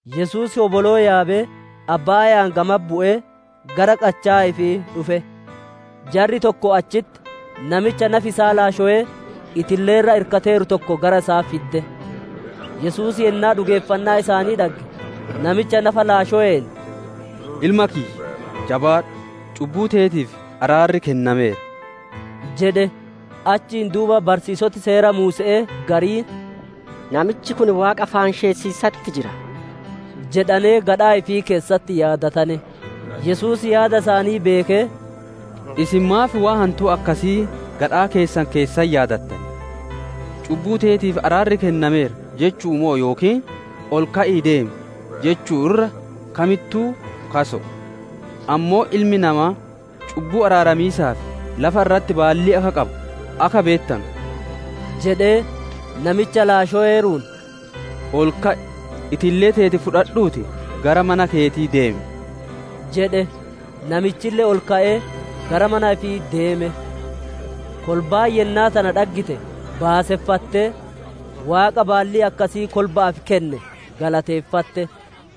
Yesuus hoboloo yaabee abbaaya'aan gamatti bu'ee gara qachaa ifii dhufe. Jarri tokko achitti namicha nafi isaa laashowee itillee irra irkateeru tokko gara isaa fidde. Yesuus yennaa dhugeeffannaa isaanii dhagge, namicha nafa laashoween, «Ilma kiyya, jabaadhu! Cubbuu teetiif araarri kennameera» jedhe. Achiin duuba barsiisoti Seera Muuse'ee gariin, «Namichi kun Waaqa faanshessiisatti jira» jedhanee gadhaa ifii keessatti yaadatane. Yesuus yaada isaanii beekee, «Isin maaf waan hantuu akkasii gadhaa keessan keessatti yaadattan? ‹Cubbuu teetiif araarri kennameera› jechu'u moo yookiin, ‹Ol ka'ii deem› jechuu irra kamittuu kaso'o? Ammoo Ilmi namaa cubbuu araaramiisaaf lafa irratti baallii akka qabu akka beettanu» jedhee, namicha laashoweeruun, «Ol ka'i! Itillee teeti fudhadhuutii gara mana keetii deem!» jedhe. Namichille ol ka'ee gara mana ifii deeme. Kolbaan yennaa tana dhaggite baaseffattee, Waaqa baallii akkasii kolba'aaf kenne galateeffatte.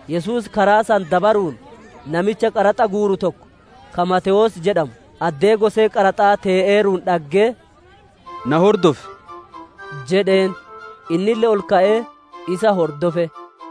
Yesuus karaa san dabaruun, namicha qaraxa guuru tokko, ka Maatewoos jedhamu, addee gosee qaraxaa tee'eeruun dhaggee, «Na hordofi» jedheen. Innille ol ka'ee isa hordofe.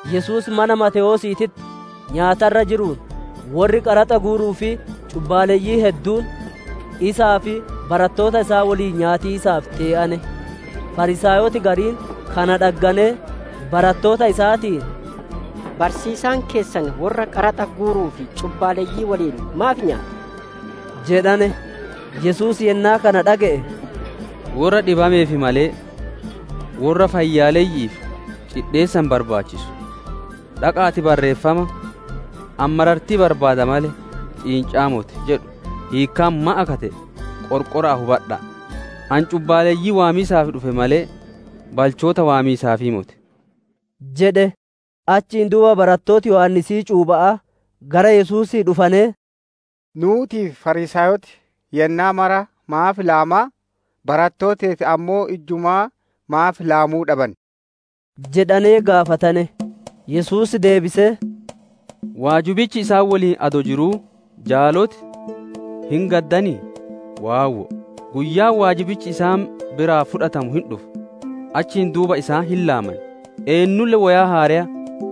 Yesuus mana Maatewoosiititti nyaata irra jiruun, worri qaraxa guuruu fi cubbaaleyyiin hedduun isaa fi barattoota isaa woliin nyaatiisaaf tee'ane. Fariisaayoti gariin kana dhagganee, barattoota isaatiin, «Barsiisaan keessan worra qaraxa guuruu fi cubbaaleyyii woliin maaf nyaata?» jedhane. Yesuus yennaa kana dhage'e, «Worra dhibameef malee, worra fayyaaleyyi'iif cidheessa hin barbaachisu. Dhaqa'aatii Barreeffama, ‹Ani marartii barbaada malee ciinca'aa moti› jedhu hiikkaan maan akka te'e qorqora'aatii hubadha'a. Ani cubbaaleyyii waamiisaaf dhufe malee, balchoota waamiisaaf moti» jedhe. Achiin duuba barattooti Yohaannisii cuupha'aa gara Yesuusii dhufanee, «Nuutii fi Fariisaayoti yennaa mara maaf laamaa, barattooti teeti ammoo ijjumaa maaf laamuu dhaban?» jedhanee gaafatane. Yesuus deebisee, «Waajibichi isaan woliin adoo jiruu jaaloti hin gaddanii? Waawwo'o! Guyyaan waajibichi isaan biraa fudhatamu hin dhufa; achiin duuba isaan hin laaman. «Eennulle woyaa haareya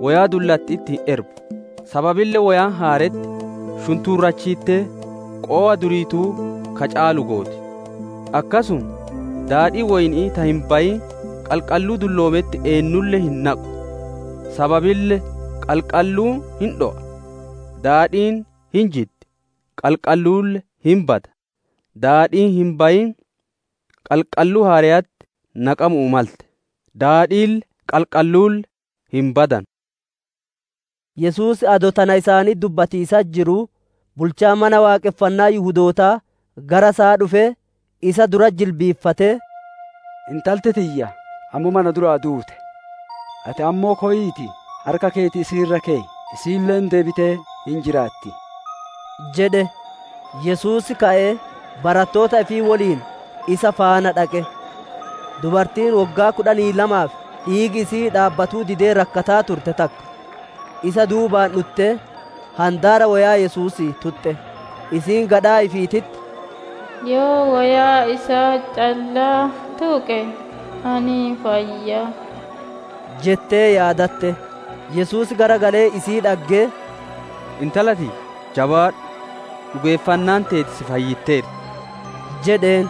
woyaa dullatti'itti hin erbu; sababille woyaan haaretti shuntuurachiittee qowa duriituu ka caalu gooti. Akkasuma daadhii woyni'ii ta hin bayiin qalqalluu dulloometti eennulle hin naqu; sababille qalqalluun hin dho'a, daadhiin hin jiddi, qalqalluulle hin bada; daadhiin hin bayin qalqalluu haareyatti naqamuu malte; daadhiille, qalqalluulle hin badanu» isaaniin jedhe. Yesuus adoo tana isaanitti dubbatiisatti jiruu, bulchaan Mana Waaqonfannaa Yihudootaa gara isaa dhufee, isa duratti jilbiiffatee, «Intalti tiyya ammuma na duraa duute; ati ammoo koyiitii harka keeti isii irra keyi; isiille deebitee hin jiraatti» jedhe. Yesuus ka'ee barattoota ifii woliin isa faana dhaqe. Dubartiin woggaa kudhanii lamaaf dhiigi isi'ii dhaabbatuu didee rakkataa turte takka isa duubaan dhuttee handaara woyaa Yesuusii tuxxe. Isiin gadhaa ifiititti, «Yoo woyaa isaa callaa tuqe, ani hin fayya» jettee yaadatte. Yesuus garagalee isii dhaggee, «Intala tiyya, jabaadhu! Dhugeeffannaan teeti si fayyitteerti» jedheen;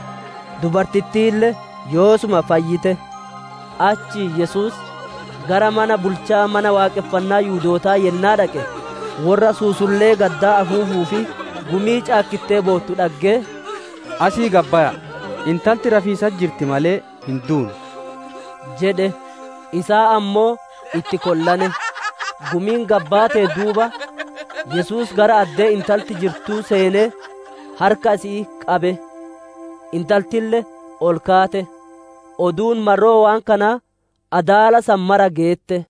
dubartittiille yoosuma fayyite. Achiin Yesuus gara mana bulchaa Mana Waaqonfannaa Yihudootaa yennaa dhaqe, worra suusullee gaddaa afuufuu fi gumii caakkittee boottu dhaggee, «Asii gad baya'a! Intalti rafiisatti jirti malee hin duune» jedhe. Isaan ammoo itti kollane. Gumiin gad baateen duuba, Yesuus gara addee intalti jirtuu seenee harka isi'ii qabe; intaltille ol kaate. Oduun marroo waan kanaa adaala san mara geette.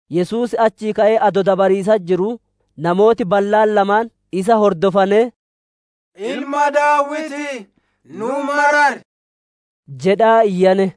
Yesuus achii ka'ee adoo dabariisatti jiruu, namooti ballaan lamaan isa hordofanee, «Ilma Daawitii, nu marari!» jedhaa iyyane.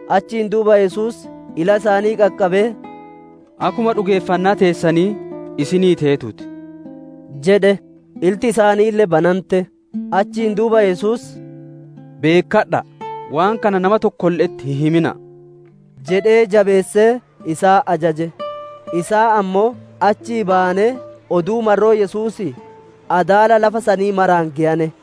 Achiin duuba Yesuus ila isaanii qaqqabee, «Akkuma dhugeeffannaa teessanii isinii teetuu ti!» jedhe; ilti isaaniille banante. Achiin duuba Yesuus, «Beekkadha'a, waan kana nama tokkolle'etti hin himina'a» jedhee jabeessee isaan ajaje. Isaan ammoo achii bayanee oduu marroo Yesuusii adaala lafa sanii maraan geyane.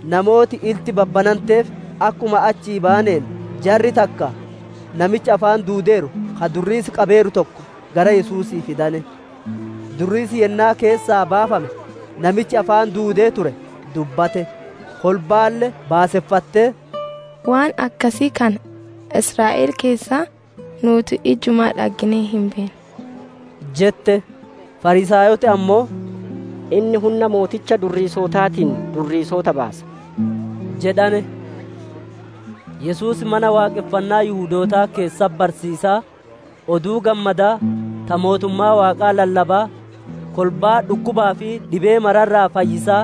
Namooti ilti babbananteef akkuma achii bayaneen, jarri takka namicha afaan duudeeru ka durriisi qabeeru tokko gara Yesuusii fadane. Durriisi yennaa keessaa baafame, namichi afaan duudee ture dubbate; kolbaalle baaseffattee, «Waan akkasii kana Israa'el keessatti nuuti ijjumaa dhagginee hin beennu!» jette. Fariisaayoti ammoo, «Inni hunna mooticha durriisotaatiin durriisota baasa» jedhane. Yesuus Mana Waaqonfannaa Yihudootaa keessatti barsiisaa, Oduu Gammadaa ta mootummaa Waaqaa lallabaa, kolbaa dhukkubaa fi dhibee mara irraa fayyisaa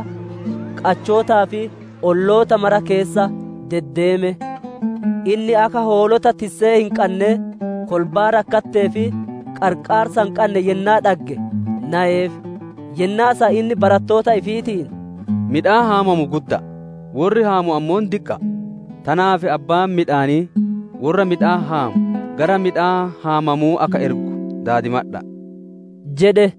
qachootaa fi olloota mara keessa deddeeme. Inni akka hoolota tissee hin qannee kolbaa rakkattee fi qarqaarsa hin qanne yennaa dhagge nayeef. Yennaa san inni barattoota ifiitiin, «Midhaan haamamu gudda'a; worri haamu ammoo diqqa'a. Tanaaf abbaan midhaanii worra miidaan haamu gara midhaan haamamuu akka ergu daadimadha'a» jedhe.